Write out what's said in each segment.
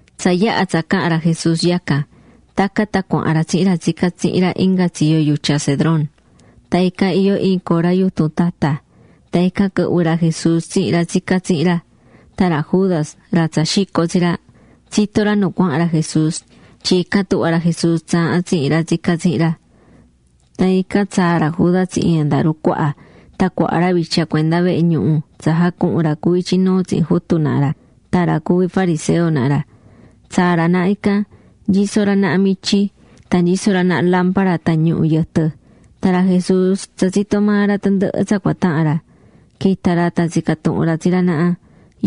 Tsa yaha̱ tsa caha̱n ra Jesús yacan, tacan tan cuahán ra tsihin ra tsicá tsihin ra inga tsiyo yutya Cedrón. Tan ican iyó iin cora yutun tata. Tan ican quɨhvɨ̱ ra Jesús tsihin ra tsicá tsihin ra. Tan ra Judas, ra tsa xico̱ tsi ra, tsitó ra nu cuahán ra Jesús tyin ican tuhvá ra Jesús tsaahán tsihin ra tsicá tsihin ra. Tan ican tsaa̱ ra Judas tsihin andaru cuaha tan cuaha ra vitya cuenda vehe ñuhu tsa jacuhun ra cuví ityi nuu tsihin jutu naha ra tan ra cuví fariseo naha ra. Tsaa̱ ra naha ican, nyisó ra naha mityi, tan nyisó ra naha lámpara tan ñuhu̱ yɨtɨ. Tan ra Jesús tsa tsitó maa ra tandɨhɨ tsa cua tahan ra. Quita̱ ra tan tsica̱ tuhun ra tsi ra naha: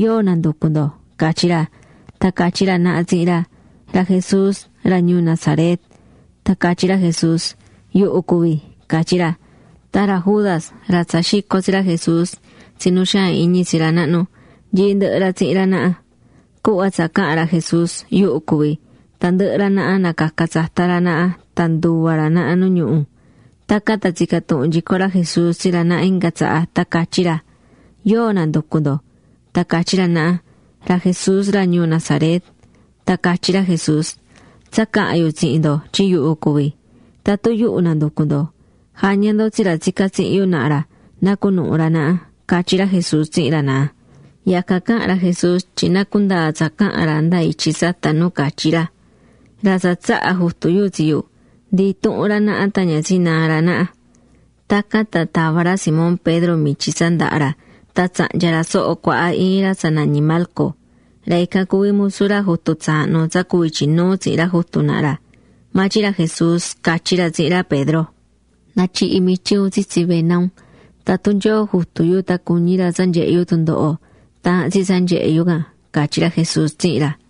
―¿Yóo nanducú ndo? ―catyí ra. Tan catyí ra naha tsihin ra: ―Ra Jesús ra ñuu Nazaret. Tan catyí ra Jesús: ―Yuhu cuví ―catyí ra. Tan ra Judas, ra tsa xico̱ tsi ra Jesús tsi nu xaan iñi tsi ra nahnu, nyií ndɨhɨ ra tsihin ra naha. Cuhva tsa caha̱n ra Jesús: “Yuhu cuví”, tandɨhɨ ra naha nacaca̱ tsata ra naha tan nduva̱ ra naha nu ñuhu. Tacan tan tsica̱ tuhun nyico ra Jesús tsi ra naha inga tsaha, tan catyí ra: ―¿Yóo nanducú ndo? Tan catyí ra naha: ―Ra Jesús ra ñuu Nazaret. Tan catyí ra Jesús: ―Tsa caha̱n yu tsihin ndo tyin yuhu cuví. Tatun yuhu nanducú ndo, ja̱ña ndo tsi ra tsicá tsihin yu naha ra na cunuhun ra naha ―catyí ra Jesús tsihin ra naha. Yacan caha̱n ra Jesús tyin na cundaa tsa caha̱n ra nda ityi tsata ca nu catyi̱ ra: “Ra tsa tsaha̱ Jutu yu tsi yu, ndi intuhun ra naha tan ña tsinaá ra naha.” Tacan tan tava̱ ra Simón Pedro mityi tsa ndahá ra tan tsahnya̱ ra soho cuaha iin ra tsa nañí Malco. Ra ican cuví musu ra jutu tsaahnu tsa cuví ityi nuu tsihin ra jutu naha ra. Maa tyin ra Jesús catyí ra tsihin ra Pedro: ―Na̱tyihi mityi un tsitsi vena un. Tatun Nyoo Jutu yu tan cuñí ra tsa nyehe yu tundoho, taahán tsi tsa nyehe yu can ―catyí ra Jesús tsihin ra.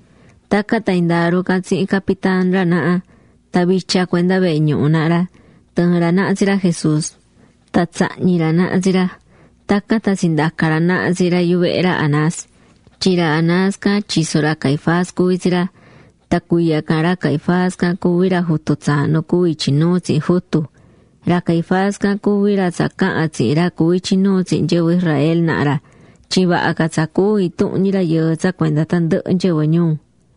Tacan tan andaru can tsihin capitán ra naha, tan vitya cuenda vehe ñuhu naha ra, tɨɨ̱n ra naha tsi ra Jesús, tan tsahñi̱ ra naha tsi ra, tacan tan tsindaca̱ ra naha tsi ra yuvehe ra Anás, tyin ra Anás can tyiso ra Caifás cuví tsi ra. Tan cuiya can ra Caifás can cuví ra jutu tsaahnu cuví ityi nuu tsihin jutu. Ra Caifás can cuví ra tsa caha̱n tsihin ra cuví ityi nuu tsihin nyɨvɨ Israel naha ra tyin vaha ca tsa cúu intuhun ñi rayɨɨ tsa cuenda tandɨhɨ nyɨvɨ ñuu.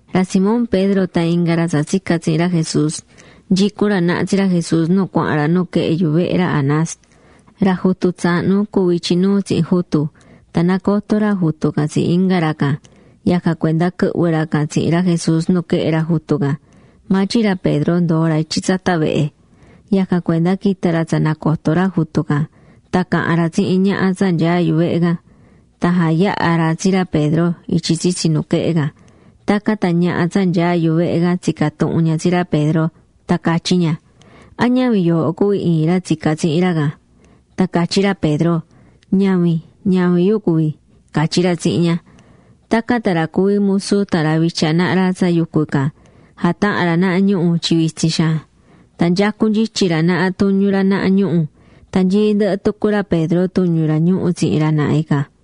Ra Simón Pedro tan inga ra tsa tsica̱ tsihin ra Jesús, nyicún ra naha tsi ra Jesús nu cuahán ra nuquehe yuvehe ra Anás, ra jutu tsaahnu cuvi̱ ityi nuu tsihin jutu. Tan nacotó ra jutu can tsi inga ra can. Yacan cuenda quɨhvɨ̱ ra can tsihin ra Jesús nuquehe ra jutu can. Maa tyin ra Pedro ndoo̱ ra ityi tsata vehe. Yacan cuenda quita̱ ra tsa nacotó ra jutu can, tan caha̱n ra tsihin ñaha tsa nyaá yuvehe can. Tan jayaha̱ ra tsi ra Pedro ityi tsitsi nuquehe can. Tacan tan ñaha tsa nyaá yuvehe can tsica̱ tuhun ña tsi ra Pedro, tan catyí ña: ―¿A ñavin yooho cuví iin ra tsica̱ tsihin ra can? Tan catyí ra Pedro: ―Ñavin. Ñavin yu cuví ―catyí ra tsihin ña. Tacan tan ra cuví musu tan ra vitya naha ra tsa yucú ican, jataha̱n ra naha ñuhu̱ tyin vitsin xaan. Tan nyecú nyityi ra naha tuñu ra naha ñuhu̱. Tan nyií ndɨhɨ tucu ra Pedro tuñu ra ñuhu̱ tsihin ra naha ican.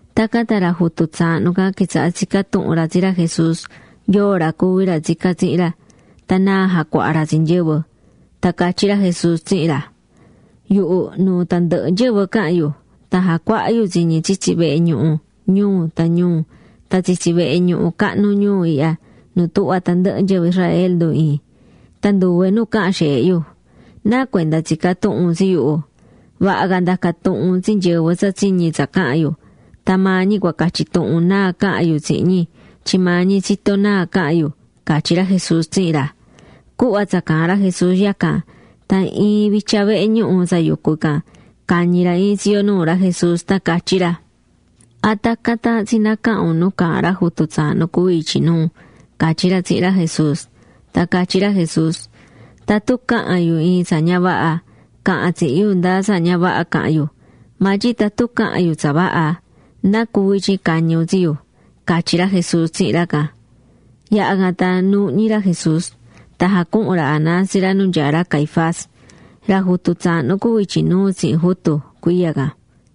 Tacan tan ra jutu tsaahnu can quitsaha̱ tsicá tuhun ra tsi ra Jesús yoo ra cuví ra tsicá tsihin ra, tan náa jacuahá ra tsi nyɨvɨ. Tan catyí ra Jesús tsihin ra: ―Yuhu nuu tandɨhɨ nyɨvɨ caha̱n yu. Tan jacuaha̱ yu tsi ñi tsitsi vehe ñuhu ñuu tan ñuu tan tsitsi vehe ñuhu cahnu ñuu ihya nu tuhvá tandɨhɨ nyɨvɨ Israel ndu iin. Tan nduve nu caha̱n xeehe yu. ¿Nacuenda tsicá tuhun un tsi yuhu? Vaha ca nda̱ca tuhun un tsi nyɨvɨ tsa tsiñi̱ tsa caha̱n yu, tan maa ñi cua catyi tuhun náa caha̱n yu tsihin ñi tyin maa ñi tsitó náa caha̱n yu ―catyí ra Jesús tsihin ra. Cuhva tsa caahán ra Jesús yacan, tan iin vitya vehe ñuhu tsa yucu ican, cañi̱ ra iin tsiyo nuu ra Jesús tan catyí ra: ―¿A tacan taahán tsi nacahan un nu caahán ra jutu tsaahnu cuví ityi nuu? ―catyí ra tsihin ra Jesús. Tan catyí ra Jesús: ―Tatun caha̱n yu iin tsa ña vaha, ca̱han tsihin yu nda tsa ña vaha caha̱n yu. Maa tyin tatun caha̱n yu tsa vaha, ¿nacuvi tyin cañi̱ un tsi yu? ―catyí ra Jesús tsihin ra can. Yaha̱ can tan nuuhñi ra Jesús, tan jacuhu̱n ra Anás tsi ra nu nyaá ra Caifás, ra jutu tsaahnu cuví ityi nuu tsihin jutu [cuiya can].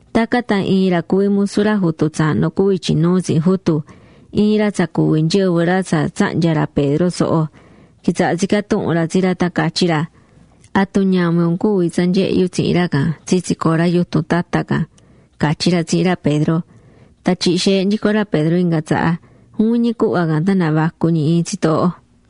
Tacan tan iin ra cuví musu ra jutu tsaahnu cuví ityi nuu tsihin jutu, iin ra tsa cuví nyɨvɨ ra tsa tsahnya̱ ra Pedro soho, quitsaha̱ tsicá tuhun ra tsi ra tan catyí ra: ―¿Atu ñavin un cuví tsa nyehe̱ yu tsihin ra can tsitsi cora yutun tata can? ―catyí ra tsihin ra Pedro. Tan tyihi̱ xeehe nyico ra Pedro inga tsaha. Juvin ñi cuhva can tan navacu̱ ñi iin tsitooho.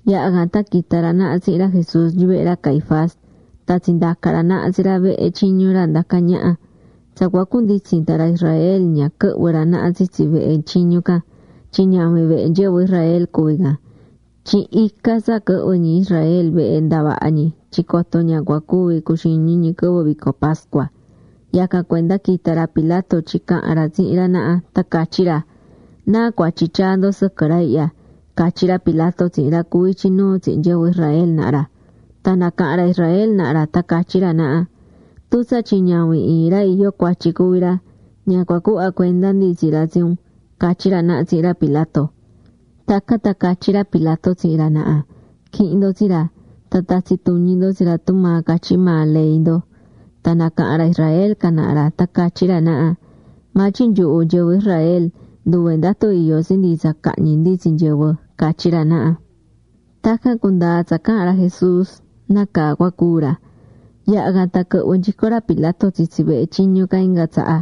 Yaha̱ can tan quita̱ ra naha tsihin ra Jesús yuvehe ra Caifás tan tsindaca̱ ra naha tsi ra vehe tyiñu ra ndacá ñaha. Tsa cua cunditsin tan ra Israel ña quɨhvɨ̱ ra naha tsitsi vehe tyiñu can tyin ñavin vehe nyɨvɨ Israel cuví can. Tyin ica tsa quɨhvɨ̱ ñi Israel vehe ndavaha ñi tyin coto ña cua cuvi cuxiñi ñi quɨvɨ vico pascua. Yacan cuenda quita̱ ra Pilato tyin cahan ra tsihin ra naha, tan catyi ra: ―¿Náa cuatyi tyaá ndo sɨquɨ ra ihya? ―catyí ra Pilato tsihin ra cuví ityi nuu tsihin nyɨvɨ Israel naha ra. Tan nacaha̱n ra Israel naha ra tan catyí ra naha: ―Tun tsatyin ñavin iin ra iyó cuatyi cuví ra, ña cua cuhva cuenda ndi tsi ra tsi un ―catyí ra naha tsihin ra Pilato. Tacan tan catyí ra Pilato tsihin ra naha: ―Qu̱ihin ndo tsi ra, tan ta̱tsi tuñi ndo tsi ra tumaa catyí maa ley ndo. Tan nacaha̱n ra Israel can naha ra tan catyí ra naha: ―Maa tyin nyuhu nyɨvɨ Israel nduve ndatu iyó tsi ndi tsa cahñi ndi tsi nyɨvɨ ―catyí ra naha. Tacan cundaa̱ tsa caha̱n ra Jesús nácaa cua cúu ra. Yaha̱ can tan quɨhvɨ̱ nyico ra Pilato tsitsi vehe tyiñu can inga tsaha.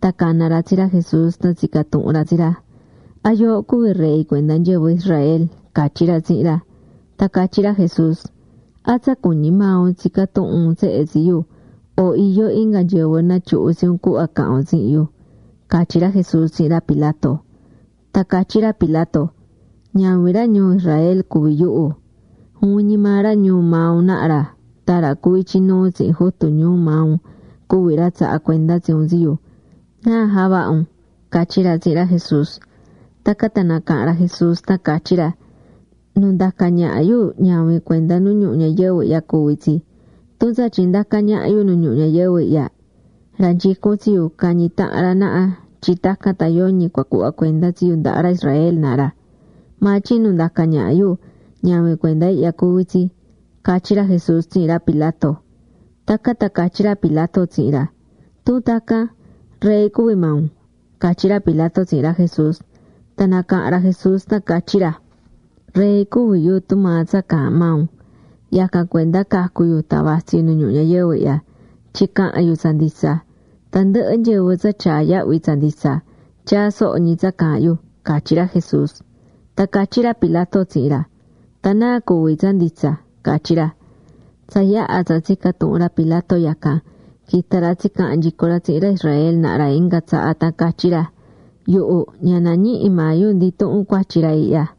Tan cana̱ ra tsi ra Jesús tan tsica̱ tuhun ra tsi ra: ―¿A yooho cuví rey cuenda nyɨvɨ Israel? ―catyí ra tsihin ra. Tan catyí ra Jesús: ―¿A tsa cuñí ñi maa un tsicá tuhun un tsehe tsi yu o iyó inga nyɨvɨ natyuhu̱ tsi un cuhva caha̱n un tsihin yu? ―catyí ra Jesús tsihin ra Pilato. Tan catyí ra Pilato: ―Ñavin ra ñuu Israel cuví yuhu. Juvin ñi maa ra ñuu maa un naha ra tan ra cuví ityi nuu tsihin jutu ñuu maa un cuví ra tsaha̱ cuenda tsi un tsi yu. ¿Náa javaha̱ un? ―catyí ra tsihin ra Jesús. Tacan tan nacaha̱n ra Jesús tan catyí ra: ―Nu ndacá ñaha yu ñavin cuenda nu ñuhu ñayɨvɨ ihya cuví tsi. Tun tsatyin ndacá ñaha yu nu ñuhu ñayɨvɨ ihya, ra nyicún tsi yu cañi tahan ra naha tyin tacan tan yoñi cua cuhva cuenda tsi yu ndaha ra Israel naha ra. Maa tyin nu ndacá ñaha yu, ñavin cuenda ihya cuví tsi ―catyí ra Jesús tsihin ra Pilato. Tacan tan catyí ra Pilato tsihin ra: ―¿Tun tacan, rey cuví maa un? ―catyí ra Pilato tsihin ra Jesús. Tan nacaha̱n ra Jesús tan catyí ra: ―Rey cuví yu tumaa tsa caahán maa un. Yacan cuenda cacu̱ yu tan vatsí yu nu ñuhu ñayɨvɨ ihya, tyin cahan yu tsa nditsa. Tandɨhɨ nyɨvɨ tsa tyaá yahvi tsa nditsa, tyaá soho ñi tsa caahán yu ―catyí ra Jesús. Tan catyí ra Pilato tsihin ra: ―¿Tan náa cuví tsa nditsa? ―catyí ra. Tsa yaha̱ tsa tsica̱ tuhun ra Pilato yacan, quita̱ ra tsicaha̱n nyico ra tsihin ra Israel naha ra inga tsaha tan catyí ra: ―Yuhu ña nañihi maa yu ndi intuhun cuatyi ra ihya.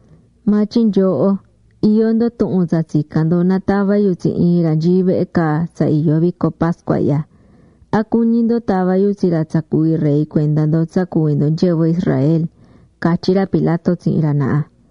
Maa tyin nyooho iyó ndo tuhun tsa tsicán ndo na tava yu tsi iin ra nyií vehe caa tsa iyó vico pascua ihya. ¿A cuñí ndo tava yu tsi ra tsa cuví rey cuenda ndo tsa cuví ndo nyɨvɨ Israel? ―catyí ra Pilato tsihin ra naha.